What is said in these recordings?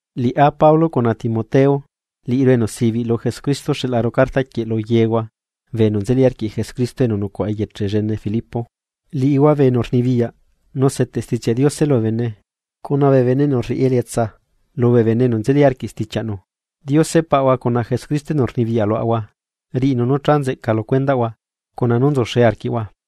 Liꞌá, Pablo cuna Timoteo, liꞌiru enu sibiꞌ lu Jesucristo xeꞌlaru cartaquieꞌ lu yehua bee enu nzeli arquiꞌ Jesucristo enu nucuaꞌa eyeche llene Filipo. Liꞌihua bee enu rnibiyaꞌ nu seteꞌ Stichiaꞌ Diose lubee bene, cuna bee enu rriꞌi elietsa lubee bene enu nzeli arquiꞌ stichiaꞌnu. Diose Paꞌahua cuna Jesucristo enu rnibiyaꞌ luaꞌahua riꞌinu nú cha nzeꞌca lu cuendaꞌhua cuna nú nzuxe arquiꞌhua.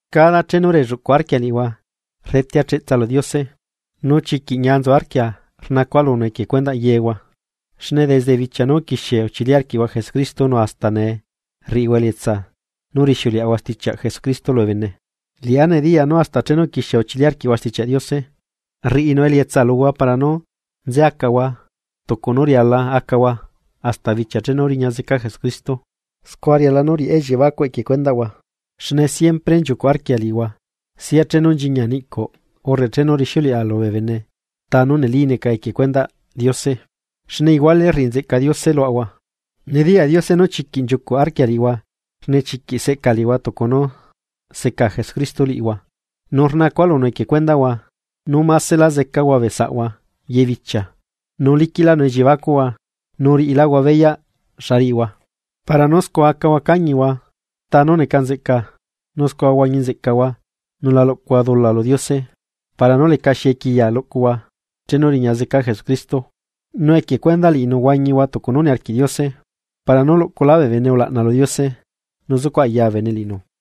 Cada chenu relluꞌcuꞌ arquia liꞌihua rdetea cheꞌtsa lu Diose, nu chiquiꞌ ñia nzu arquia rnacua lunu equie cuendaꞌ yehua, xne desde bichiaꞌ nú uquixie uchili arquiꞌhua Jesucristo nu hasta nee rriꞌihua elietsa nú rixiuleꞌahua stichiaꞌ Jesucristo lubee bene. Liꞌá nediyaa nú hasta chenu uquixie uchili arquiꞌhua Stichiaꞌ Diose rriꞌinu elietsa luhua para nú nze acahua tucu nú riala acahua hasta bichia chenu riña zeca Jesucristo. Scua riala nú riꞌa elliebacuꞌ equie cuendaꞌhua, xne siempre nchiucuꞌ arquia liꞌihua, sia chenu nchiñia niꞌcuꞌ urre chenu rixiuleꞌa lubee bene ta nú neli neca equie cuendaꞌ Diose xne iguale rriꞌi nzeꞌca Diose luaꞌahua. Nediyaꞌ Diose nú chiquiꞌ nchiucuꞌ arquia liꞌihua xne chiquiꞌ seꞌca liꞌihua tucu nú seca Jesucristo liꞌihua. Nu rnacua lunu equie cuendaꞌhua, nú másela zecahua bee saꞌhua ye bichia nu liquiꞌlánu elliebacuꞌhua nú riꞌiláhua beyaꞌ xa riꞌihua, para nú scua acahua cañihua ta nú neca nzeꞌca nu scua huañi nzeꞌcahua nu la luꞌcuhua dula lu Diose para nú lecaxi equiya luꞌcuhua chenu riña zeca Jesucristo. Nu equie cuendaꞌ liꞌinu huañihua tucu nú niarquiꞌ Diose para nú luꞌculá bee bene ulaꞌna lu Diose nu zucuꞌ aya bee bene liꞌinu.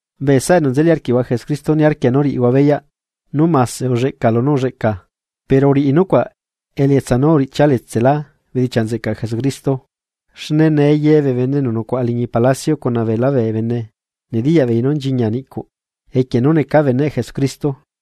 Bee saꞌa enu nzeli arquiaꞌahua Jesucristo niarquia nú riꞌihua beyaꞌ nú mase ulleꞌca lunú ulleꞌca pero uriꞌi nucuaꞌ elietsa nú uriꞌchia letselá bedichiaꞌ nzeꞌcaꞌ Jesucristo. Xne nee yebee bene enu nucuaꞌa liñi palacio cuna beelá bee bene nediyaꞌbeei nú nchiñia niꞌcuꞌ equie nú necaa beneꞌ Jesucristo.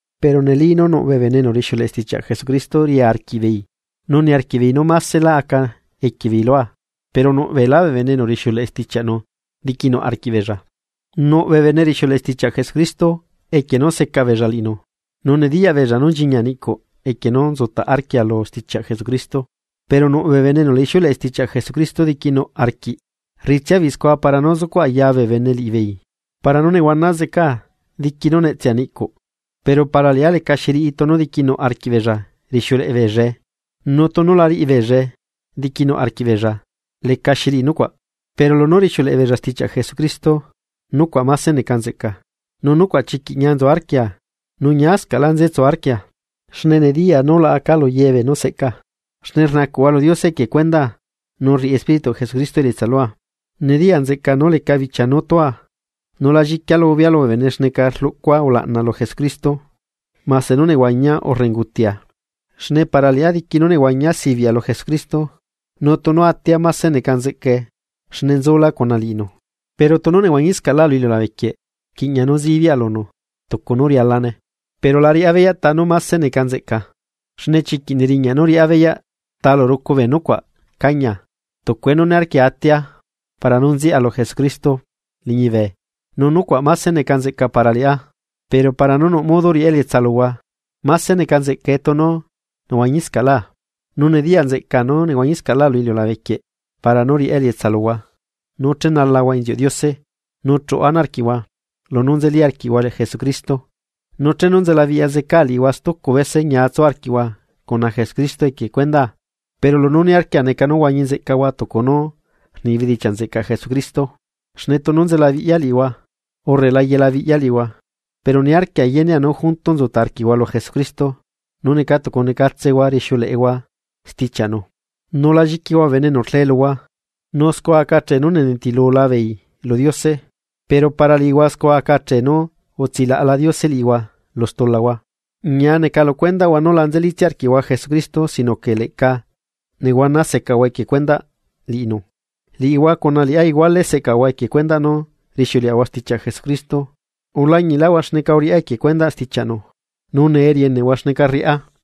Pero neli nú nuꞌbee bene enu rixiuleꞌe stichiaꞌ Jesucristo ria arquiꞌbeei, nu niarquiꞌbeei nú másela aca equiebeei lua, pero nuꞌ beelá bee bene enu rixiuleꞌe stichiaꞌnu diquinuꞌ arquiꞌbeella. Nuꞌ bee bene rixiuleꞌe stichiaꞌ Jesucristo equie nú secabeella liꞌinu, nu nediyaꞌbeella nú nchiñia niꞌcuꞌ equie nú nzutaꞌ arquia lu stichiaꞌ Jesucristo. Pero nuꞌ bee bene enu la ixiuleꞌe stichiaꞌ Jesucristo diquinuꞌ arquiꞌ, rriꞌitsia beella scua para nú zucuꞌ aya bee bene liꞌibeela para nú nehuana zecaa diqui nú netsea niꞌcuꞌ. Pero para liꞌá lecaxi riꞌi tunu diquinuꞌ arquiꞌbeella rixiuleꞌe beella stichiaꞌ Jesucristo nu tunu la riꞌi beellae diqui nuꞌ arquiꞌbeella lecaxi riꞌi nucuaꞌ, pero lunú rixiuleꞌe beella stichiaꞌ Jesucristo nucuaꞌ mase neca nzeꞌca, nu nucuaꞌ chiquiꞌ ñia nzu arquia, nu ñiascaꞌla nzetsu arquia. Xne nediyaa nú laꞌacaa lu yebeenú seꞌcaa, xne rnacuꞌhua lu Diose equie cuendaa nu rriꞌi Espírituꞌ Jesucristo elietsa lua. Nediya nzeꞌcaa nú leca bichia nú tua, nu la lliquia lubea lubee bene xneca rluꞌcua ulaꞌna lu Jesucristo, mase nú nehuañia urre ungutiaa. Xne para liꞌá diqui nú nehuañia sibiꞌa lu Jesucristo, nu tunu atia máse neca nzeꞌcae xne nzula cuna liꞌinu. Pero tunu nehuañiscaꞌa lu iliulabequieꞌ, rquiꞌña nú zibiaꞌa lunu tucu nú rialane. Pero la riꞌá beyaꞌ ta nú máse neca nzeꞌca. Xne chiquiꞌ neriñaꞌ nú riꞌá beyaꞌ ta lu rucu bee nucuaꞌ cañia. Tucue nú niarquia atia para nú nziaꞌa lu Jesucristo liñibe, nu nucuaꞌ máse neca nzeꞌca para liꞌá, pero para nú nuꞌ modo riꞌá elietsa luhua, máse neca nzeꞌcae tunu nehuañiscaꞌlá. Nu nediya nzeꞌcaa nú nehuañiscaꞌlá lu iliulabequieꞌ para nú riꞌa elietsa luhua nú chenalahua inziuꞌ Diose nu chuꞌu ana arquiꞌhua lunú nzeli arquiꞌhua Jesucristo. Nu chenu nzelabiꞌya zecaa liꞌihua stucu bese ñia tsu arquiꞌhua cuna Jesucristo equie cuendaa. Pero lunú niarquia neca nú huañi nzeꞌcahua tucu nú rni bedichiaꞌ nzeꞌcaꞌ Jesucristo. Xne tunu nzelabiꞌyahua, urre la yelabiꞌyahua, pero niarquia yenea nú junto nzutaꞌ arquiꞌhua lu Jesucristo nu neca tucunecatsehua rixiuleꞌehua stichiaꞌnu, nu la lliquihua bee bene enu rle luhua. Nu scua aca achee nú nenitilula beei lu Diose, pero para liꞌihua scua acachee nú utsilaꞌala Diose liꞌihua lu stulahua. Ñia neca lu cuendaꞌhua nu la nzelitsia arquiꞌhua Jesucristo sino que leꞌca nehuana secahua equie cuendaꞌ liꞌinu. Liꞌihua cuna liꞌá iguale seꞌcaꞌahua equie nú rixiuleꞌahua stichiaꞌ Jesucristo, ulañiꞌlaꞌhua xneca uriꞌá equie cuendaꞌ stichiaꞌnu, nu nee rieneꞌhua xneca rriꞌá.